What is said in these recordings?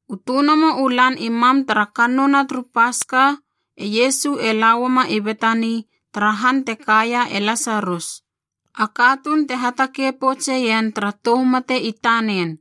U tönomo u lan i mam tara kannouna turu Paska e Iesu e lauama i Betani tara han te kaia e Lasarus, a katuun te hatakei poutseien tara tou mate i tanen.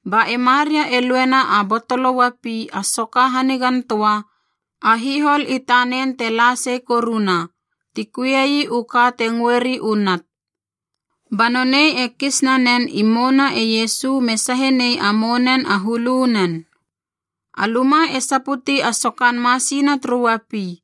Ba e Maria e luena a botolo uapi a soka hanigantöa a hihol i tanen te la sei koruna, ti kuiei u ka te ngöri u nat. Ba nonei e kis nanen i mouna e Iesu me sahe nei a mounen a hulunen. A luma e saputi a sokan masina turu uapi.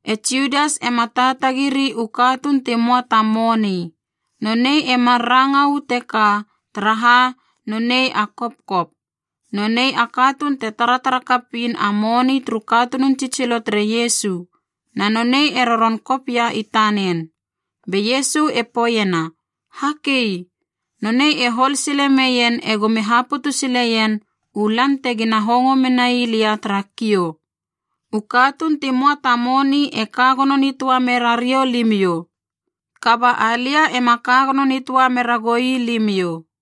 E Judas e ma taatagiri u katuun ti möa ta moni. Nonei e mar ranga uu teka, taraha nonei a kopkop. Nonei a katuun te taratara kapiin a moni turu katunun tsitsilo tere Iesu, na nonei e roron kop ia i tanen. Be Iesu e poeiena, “Hakei! Nonei e hol sile meien egomi haputu sileien u lan tegina hongo menai lia tara kiou. U katuun ti möa ta moni e ka gono nitöa mera riou limiou. Kaba alia ema ka gono nitöa mera goi limiou.”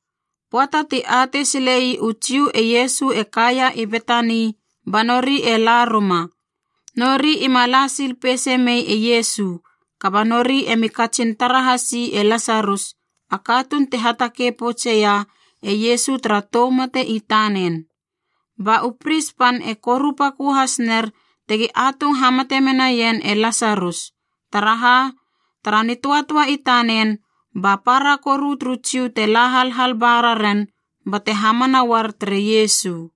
Pöata ti atei silei u Jiu e Iesu e kaia i Betani ba nori e la ruma. Nori ima la sil peise mei e Iesu, kaba nori emi katsin tara hasi e Lasarus, a katuun ti hatakei poutseia e Iesu tara tou mate i tanen. Ba u Pris pan e koru pakö has ner tegi atung hamate menaien e Lasarus, taraha, tara nitöatöa i tanen ba para koru turu Jiu te la halhal ba raren bate hamana uar tere Iesu.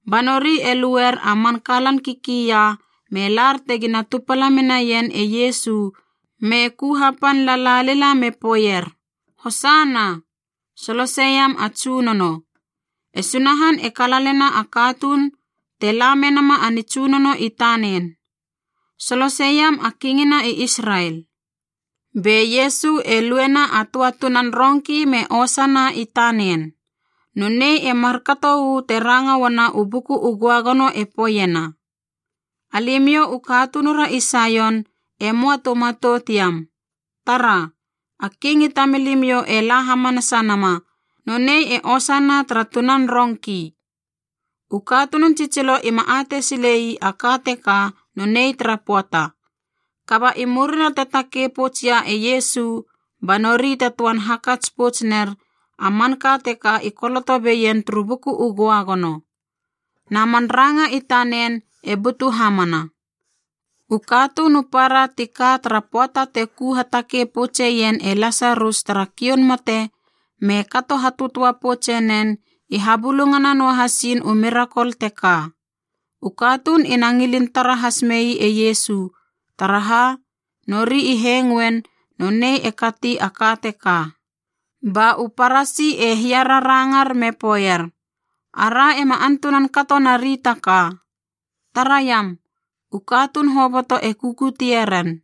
Ba nori e luer a man kalan kikia me lar tegina tupala menaien e Iesu me ku hapan lala lila me poeier, “Hosana! (Soloseiam a Tsunono) E Sunahan e kalalena a katuun te la menama a nitsunono i tanen! Soloseiam a Kingina i Israel!” Be Iesu e luena a töa tunan rongki me osana i tanen. Nonei e markato uu te ranga uana u Buku u Göagono e poeiena: “Alimiou u katunura i Saion e möa tu matout iam. Tara, a King i tamilimiou e la hamanasa nama nonei e osana tara tunan rongki.” U katunun tsitsilo ima atei silei a ka teka nonei tara pöata. Kaba i murina te takei pouts ia e Iesu, ba nori te töan hakats pouts ner a manka teka i koloto beien turu Buku u Göagono, na man ranga i tanen e butu hamana. U katuun u para tika tara pöata te ku hatakei poutseien e Lasarus tara kioun mate me kato hatöatöa poutse nen i habulungana noahasin u mirakol teka. U katuun ina ngilin tara has mei e Iesu, Taraha, nori i hengoein nonei e kati a ka teka. Ba u Parasi e hiararangar me poeier, “Ara ema antunan kato nari taka. Taraiam, u katuun hoboto e kukutie ren!”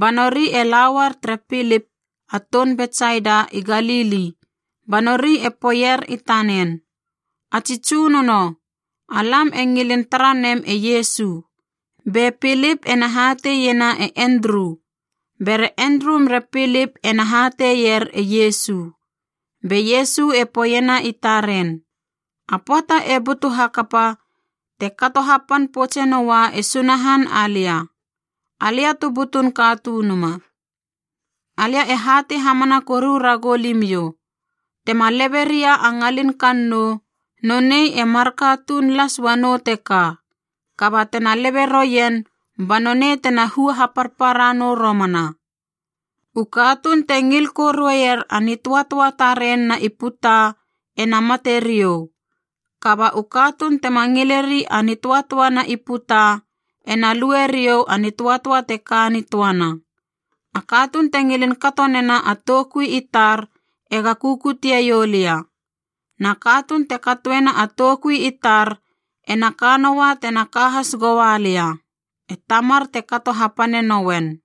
Ba nori e la uar tere Pilip, a toun Betsaida i Galili, ba nori e poeier i tanen, “A tsi tsunono, alam e ngilin tara nem e Iesu.” Be Pilip ena hateiena e Endru. Bere Endru mere Pilip ena hateier e Iesu. Be Iesu e poeiena i taren, “A pöata e butu hakapa te kato hapan poutse noa e Sunahan alia, Alia tu butun Katunuma. Alia e hatei hamana koru ragou limiou. Tema lebe ria a ngalin kannou, nonei e marka tuun las uanou teka. Kaba tena lebe roien ba nonei tena hua haparpara nou romana. U katuun te ngil korueier a nitöatöa taren na i puta ena mate riou. Kaba u katuun tema ngileri a nitöatöa na i puta ena lueriou a nitöatöa te ka nitöana. A katuun te ngilin kato nena a toukui i tar ega kukutie iou lia. Na katuun te katoena a toukui i tar ena ka noua tena ka has goua lia, e Tamar te kato hapane nouen.”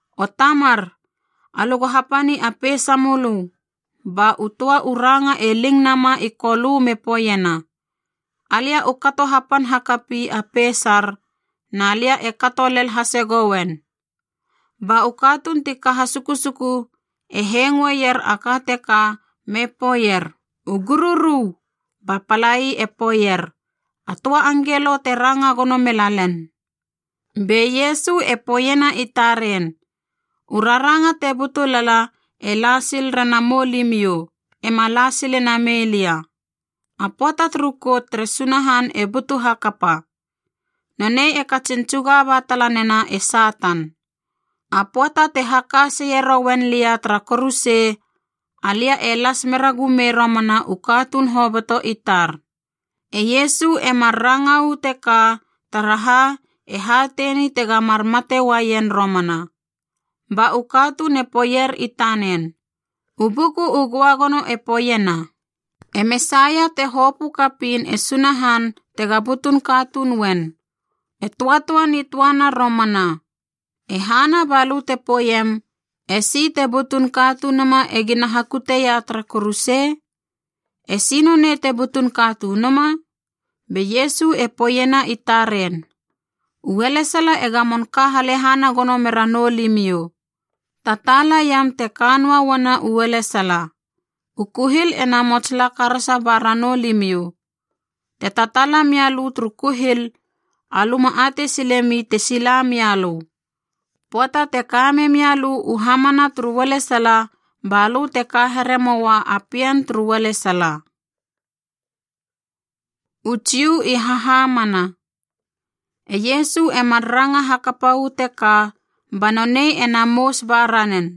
O Tamar, alö go hapani a peisa mölö.” Ba u töa u ranga e ling nama i Kolö me poeiena, “Alia u kato hapan hakapi a peisar na lia e kato lel hase gouen.” Ba u katuun ti ka hasukusuku e hengoeir a ka teka me poeier, u gururu! Ba palai e poeier, “A töa angelo te ranga gono mela len!” Be Iesu e poeiena i taren, “U raranga te butu lala e la sil rena moulimiou, ema la sile namei lia. A pöata turu kout tere Sunahan e butu hakapa. Nonei e katsin tsuga ba tala nena e Satan. A pöata te haka seie rouen lia tara kuruse, alia e las meragumei romana u katuun hoboto i tar.” E Iesu e mar ranga uu teka taraha e hateini tega mar mate uaien romana. Ba u katuun e poeier i tanen, “U Buku u Göagono e poeiena, e Mesaia te hopö kapiin e Sunahan tega butun katuun uen, e töatöa nitöana romana. E hana balö te poeiem, ‘E si te butun katunuma egi na hakuteia tara kuruse’? E si nonei te butun katunuma?” Be Iesu e poeiena i taren, “Ualesala e gamon ka halehana gono mera noulimiou. Tataala iam te ka noa uana ualesala. U kuhil ena mots la karasa ba ranou limiou. Te tataala mia lö turu kuhil, alö ma atei sile mi te sila mia lö. Pöata te ka memia lö u hamana turu ualesala balö te ka here moua a pien turu ualesala.” U Jiu i hahamana E Iesu e mar ranga hakapa uu teka ba nonei ena mous ba ranen.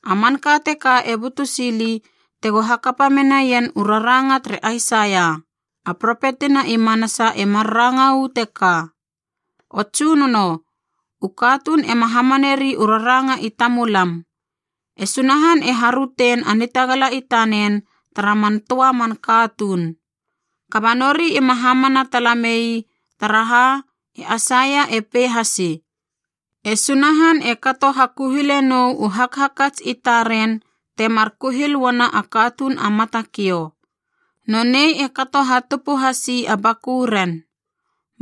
A manka teka e butu sili tego hakapa menaien u raranga tere Aisaia, a propetina i manasa e mar ranga uu teka: “O Tsunono, u katuun ema hamaneri u raranga i tamulam. E Sunahan e harötein a nitagala i tanen tara man töa man katuun.” Kaba nori ima hamana tala mei, taraha e Aisaia e pei hasi, “E Sunahan e kato hakuhilenou u hakhakats i taren temar kuhil uana a katuun a matakiou. Nonei e kato hatupu hasi a bakuren.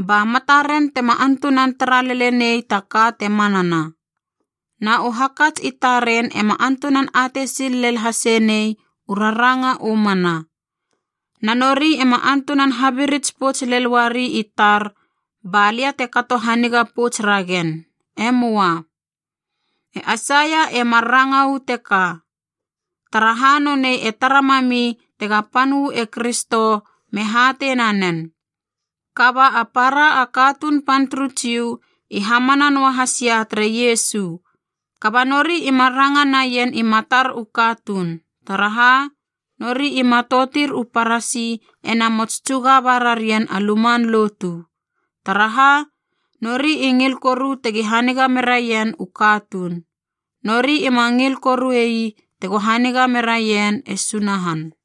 Ba mataren tema antunan tara lele nei a ka te manana, na u hakats i taren ema antunan atei sil lel hase nei u raranga u mana. Na nori ema antunan habirits pouts lel uari i tar ba lia te kato haniga pouts ragen. E möa.” E Aisaia e mar ranga uu teka, taraha nonei e tara mami tega pan uu e Kristo me hatei nanen. Kaba a para a katuun pan turu Jiu i hamana noa hasia tere Iesu. Kaba nori ima ranga naien i matar u katuun, taraha nori i matoutir u Parasi ena mots tsuga ba rarien a luman lotu. Taraha! Nori i ngil koru tegi haniga meraien u katuun. Nori ima ngil korui tego haniga meraien e Sunahan.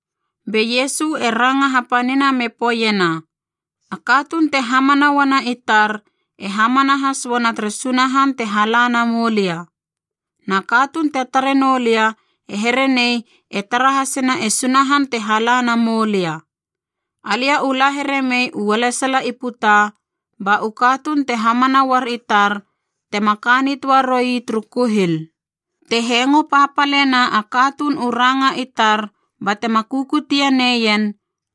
Be Iesu e ranga hapanina me poeiena, “A katuun te hamana uana i tar e hamana has uana tere Sunahan te hala na moulia. Na katuun te tare noulia e here nei e tara hasena e Sunahan te hala na moulia. Alia u la here mei ualesala i puta ba u katuun te hamana uar i tar tema ka nitöa roi turu kuhil. Te hengo papalena a katuun u ranga i tar batema kukutie neien,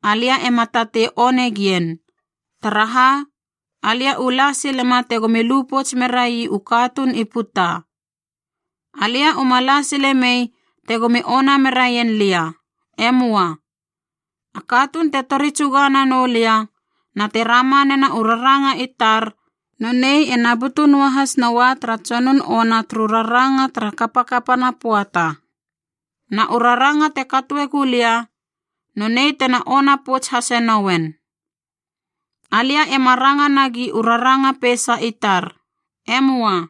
alia ema tatei one gien. Taraha, alia u la silema tegomi lu pouts merai u katuun i puta. Alia uma la sile mei tegomi ona meraien lia. E möa. A katuun te tori tsuga nanou lia na te rama nena u raranga i tar, nonei ena butu noa has noua tara tsonun ona turu raranga tara kapakapana pöata. Na u raranga te katoe gulia nonei tena ona pouts hase nouen. Alia ema ranga nagi u raranga peisa i tar. E möa.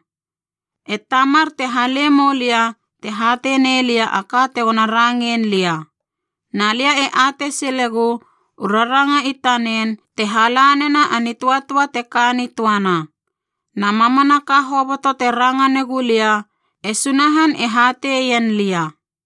E Tamar te hale moulia te hatei nelia a ka tego rangein lia. Na lia e atei silegu u raranga i tanen te hala nena a nitöatöa te ka nitöana. Na mamanaka hoboto te ranga negu lia e Sunahan e hateien lia.”